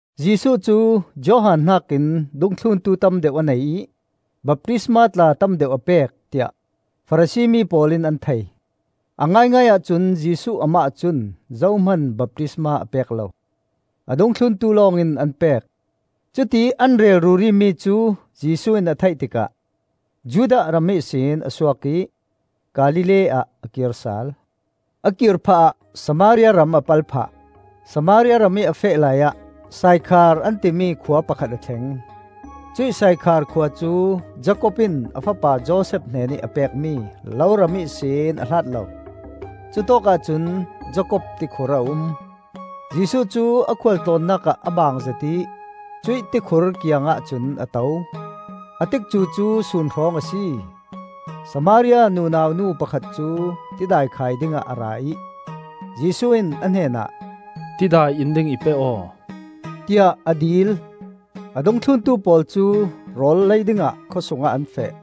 Jesuh cu Johan hnakin dungthluntu tam deuh a nei ih baptisma tla tam deuh a pek, tiah Farasi mi pawl in an thei. A ngaingai ahcun Jesuh amah cun zohman baptisma a pek lo; a dungthluntu lawng in an pek. Cutiih an rel ruri mi cu Jesuh in a theih tikah Judah ram ihsin a suak ih Galilee ah a kir sal. A kir phahah Samaria ram a pal phah. Samaria ramih a feh laiah Saikhar an timi khua pakhat a thleng. Cuih Saikhar khua cu Jakob in a fapa Josef hnenih a pekmi loram ihsin a hlat lo. Cutawkah cun Jakob tikhur a um. Jesuh cu a khual tlawnnak ah a bang zet ih cuih tikhur kiangah cun a to. A tikcu cu sun hrawng a si. Samaria nunau nu pakhat cu tidai khai dingah a ra ih Jesuh in a hnenah, “Tidai in ding i pe aw,” tiah a dil. A dungthluntu pawl cu rawl lei dingah khawsung ah an feh.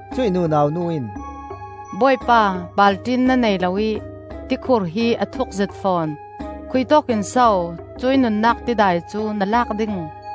Cuih nunau nu in, “Bawipa, balṭin na nei lo ih tikhur hi a thuk zet fawn. Khuitawk in so cuih nunnak tidai cu na lak ding?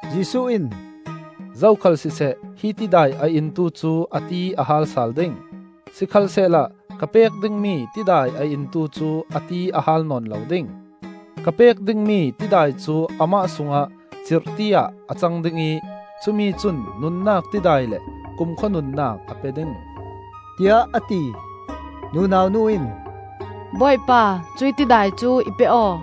Jesuh in, “Zokhal siseh hi tidai a intu cu a ti a haal sal ding. Sikhalsehla ka pek dingmi tidai a intu cu a ti a haal nawn lo ding. Ka pek dingmi tidai cu amah sungah cirhti ah a cang ding ih cumi cun nunnak tidai le kumkhua nunnak a pe ding,” tiah a ti. Nunau nu in, “Bawipa, cuih tidai cu i pe aw!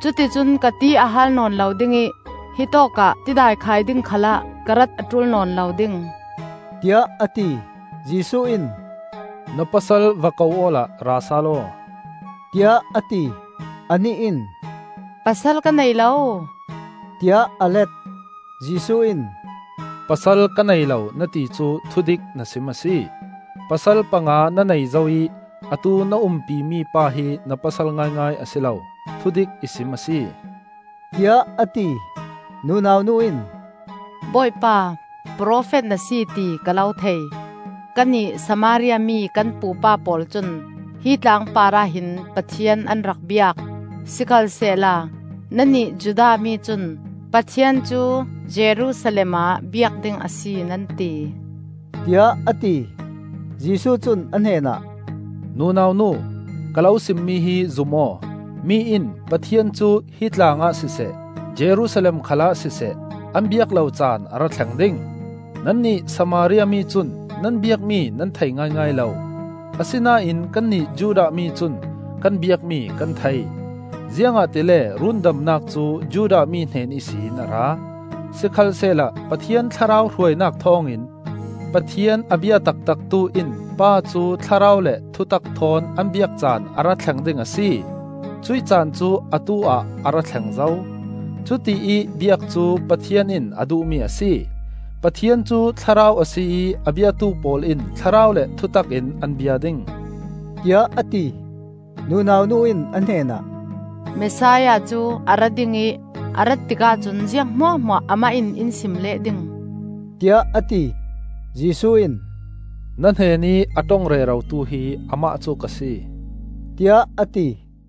Cuticun ka ti a haal nawn lo ding ih hitawk ah tidai khai ding khalah ka rat a ṭul nawn lo ding,” tiah a ti. Jesuh in, “Na pasal va ko awla ra sal aw,” tiah a ti. Anih in, “Pasal ka nei lo,” tiah a let. Jesuh in, “Pasal ka nei lo na ti cu thudik na sim a si. Pasal panga na nei zo ih atu na umpi mi pa hi na pasal ngaingai a si lo. Thudik i sim a si,” tiah a ti. Nunau nu in, “Bawipa, profet na si ti ka lo thei. Kannih Samaria mi kan pupa pawl cun hi tlang parah hin Pathian an rak biak; sikhalsehla nannih Judah mi cun Pathian cu Jerusalem ah biak ding a si, nan ti,” tiah a ti. Jesuh cun a hnenah, “Nunau nu, ka lo simmi hi zum aw: Mi in Pathian cu hi tlang ah siseh, Jerusalem khal ah siseh, an biak lo can a ra thleng ding. Nannih Samaria mi cun nan biakmi nan thei ngaingai lo; asinain kannih Judah mi cun kan biakmi kan thei, ziangahtile rundamnak cu Judah mi hnen ihsin a ra. Sikhalsehla Pathian Thlarau hruainak thawngin Pathian a bia taktaktu in Pa cu thlarau le thutak thawn an biak caan a ra thleng ding; a si, cuih caan cu atu-ah a ra thleng zo. Cutiih biak cu Pathian in a duhmi a si. Pathian cu Thlarau a si ih a biatu pawl in thlarau le thutak in an bia ding,” tiah a ti. Nunau nu in a hnenah, “Messiah cu a ra ding ih a rat tikah cun ziang hmuahhmuah amah in in sim leh ding,” tiah a ti. Jesuh in, “Na hnenih a ṭong rerotu hi amah cu ka si,” tiah a ti.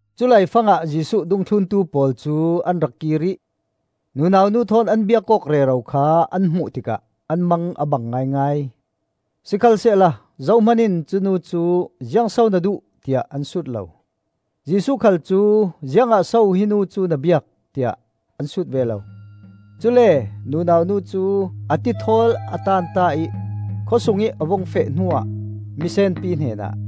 Culai fangah Jesuh dungthluntu pawl cu an ra kir ih nunau nu thawn an biak awk rero kha an hmuh tikah an mang a bang ngaingai. Sikhalsehla zohman in cu nu cu, “Ziang so na duh?” tiah an sut lo. Jesuh khal cu, “Ziangah so hi nu cu na biak?” tiah an sut ve lo. Cule nunau nu cu a tithawl a tanta ih khawsungih a vung feh hnuah mi senpi hnenah,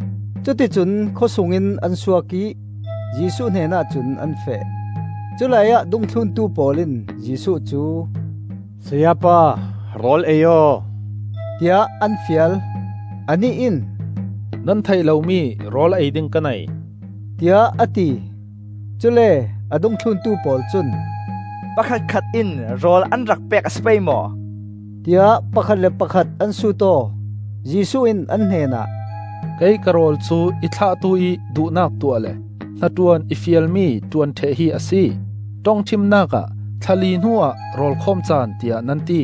Cuticun khawsung in an suak ih Jesuh hnenah cun an feh. Culai ah dungthluntu pawl in Jesuh cu, “Sayapa, rawl ei aw,” tiah an fial. Anih in, “Nan theih lomi rawl ei ding ka nei,” tiah a ti. Cule a dungthluntu pawl cun, “Pakhatkhat in rawl an rak pek a si pei maw?” tiah pakhat le pakhat an sut aw. Jesuh in an hnenah, “Kei ka rawl cu i thlahtu-ih duhnak tuah le hnaṭuan i fialmi ṭuan ṭheh hi a si. Ṭongṭhimnak ah ‘Thla li hnuah rawl khawm caan,’ tiah nan ti.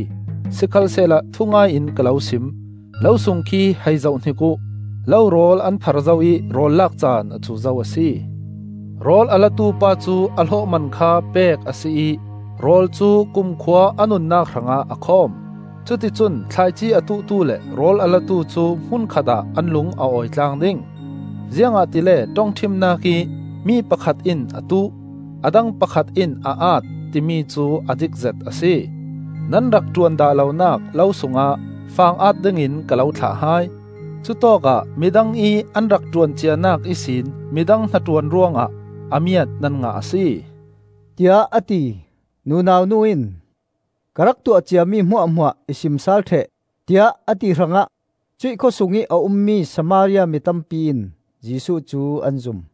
Sikhalsehla thungai in ka lo sim: lo sung khi hei zohhnik uh! Lorawl an thar zo ih rawl lak caan a cu zo a si. Rawl a latu pa cu a hlawhman kha pek a si ih rawl cu kumkhua a nunnak hrangah a khawm. Cuticun thlaici a tuhtu le rawl a latu cu hmun khatah an lung a awi tlang ding. Ziangahtile ṭongṭhimnak ih ‘Mi pakhat in a tuh; a dang pakhat in a at,’ timi cu a dikzet a si. Nan rak ṭuan dah lonak lo sungah fang at dingin ka lo thlah hai. Cutawkah midang ih an rak ṭuan cianak ihsin midang hnaṭuan ruangah a miat nan ngah a si,” tiah a ti. Nunau nu in, “Ka rak tuah ciami hmuahhmuah i sim sal ṭheh,” tiah a ti hrangah cuih khawsungih a ummi Samaria mi tampi in Jesuh cu an zum.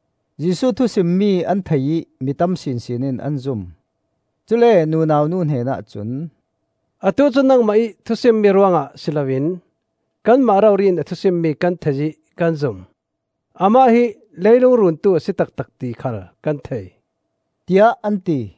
Jesuh thusimmi an thei ih mi tam sinsin in an zum. Cule nunau nu hnenah cun, “Atu cu nangmah ih thusimmi ruangah si loin kanmah rori in a thu simmi kan thei ih kan zum; amah hi leilung Runtu a si taktak ti khal kan thei,” tiah an ti.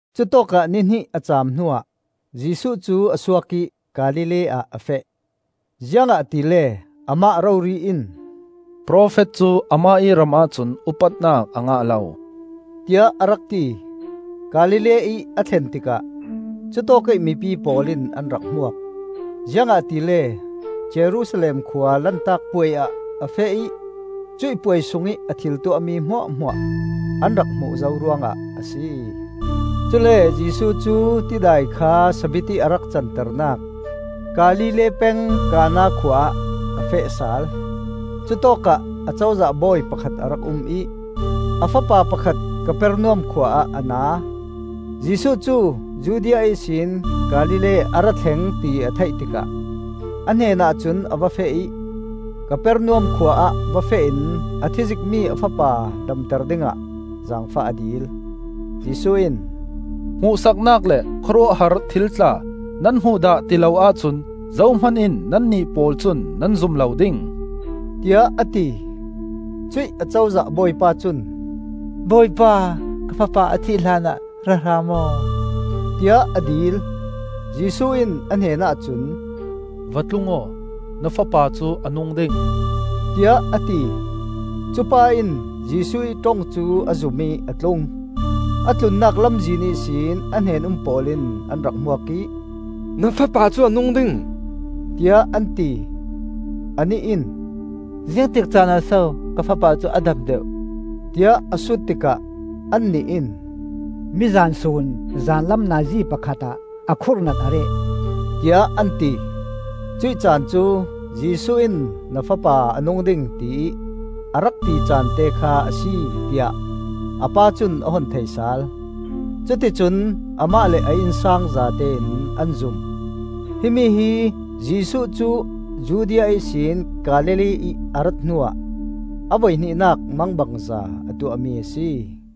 Cutawkah ni hnih a cam hnuah Jesuh cu a suak ih Galilee ah a feh. Ziangahtile amah rori in, “Profet cu amah ih ramah cun upatnak a ngah lo,” tiah a rak ti. Galilee-ih a thlen tikah cutawkih mipi pawl in an rak hmuak, ziangahtile Jerusalem khua Lantak Puai ah a feh ih cuih puai sungih a thil tuahmi hmuahhmuah an rak hmuh zo ruangah a si. Cule Jesuh cu tidai kha sabitti ih a rak canternak Galilee peng Kana khua ah a feh sal. Cutawkah acozah bawi pakhat a rak um ih a fapa pakhat Kapernaum khua ah a na. Jesuh cu Judea ihsin Galilee a ra thleng ti a theih tikah a hnenah cun a va feh ih, Kapernaum khua ah va feh in a thizikmi a fapa damter dingah zaangfah a dil. Jesuh in, “Hmuhsaknak le khawruahhar thil tla nan hmuh dah ti lo ahcun zohman in nannih pawl cun nan zum lo ding,” tiah a ti. Cuih acozah bawipa cun, “Bawipa, ka fapa a thih hlanah ra hram aw,” tiah a dil. Jesuh in a hnenah cun, “Va tlung aw, na fapa cu a nung ding,” tiah a ti. Cupa in Jesuh ih ṭong cu a zum ih a tlung. A tlunnak lamzin ihsin a hnen-um pawl in an rak hmuak ih, “Na fapa cu a nung ding,” tiah an ti. Anih in, “Ziangtik caanah so ka fapa cu a dam deuh?” tiah a sut tikah annih in, “Mizan sun zanlam nazi pakhat ah a khurhnat a reh,” tiah an ti. Cuih caan cu Jesuh in ‘Na fapa a nung ding,’ tiih a rak ti caante kha a si, tiah a pa cun a hun thei sal. Cuticun amah le a innsang zatein an zum. Himi hi Jesuh cu Judea ihsin Galilee-ih a rat hnuah a voihnihnak mangbangza a tuahmi a si.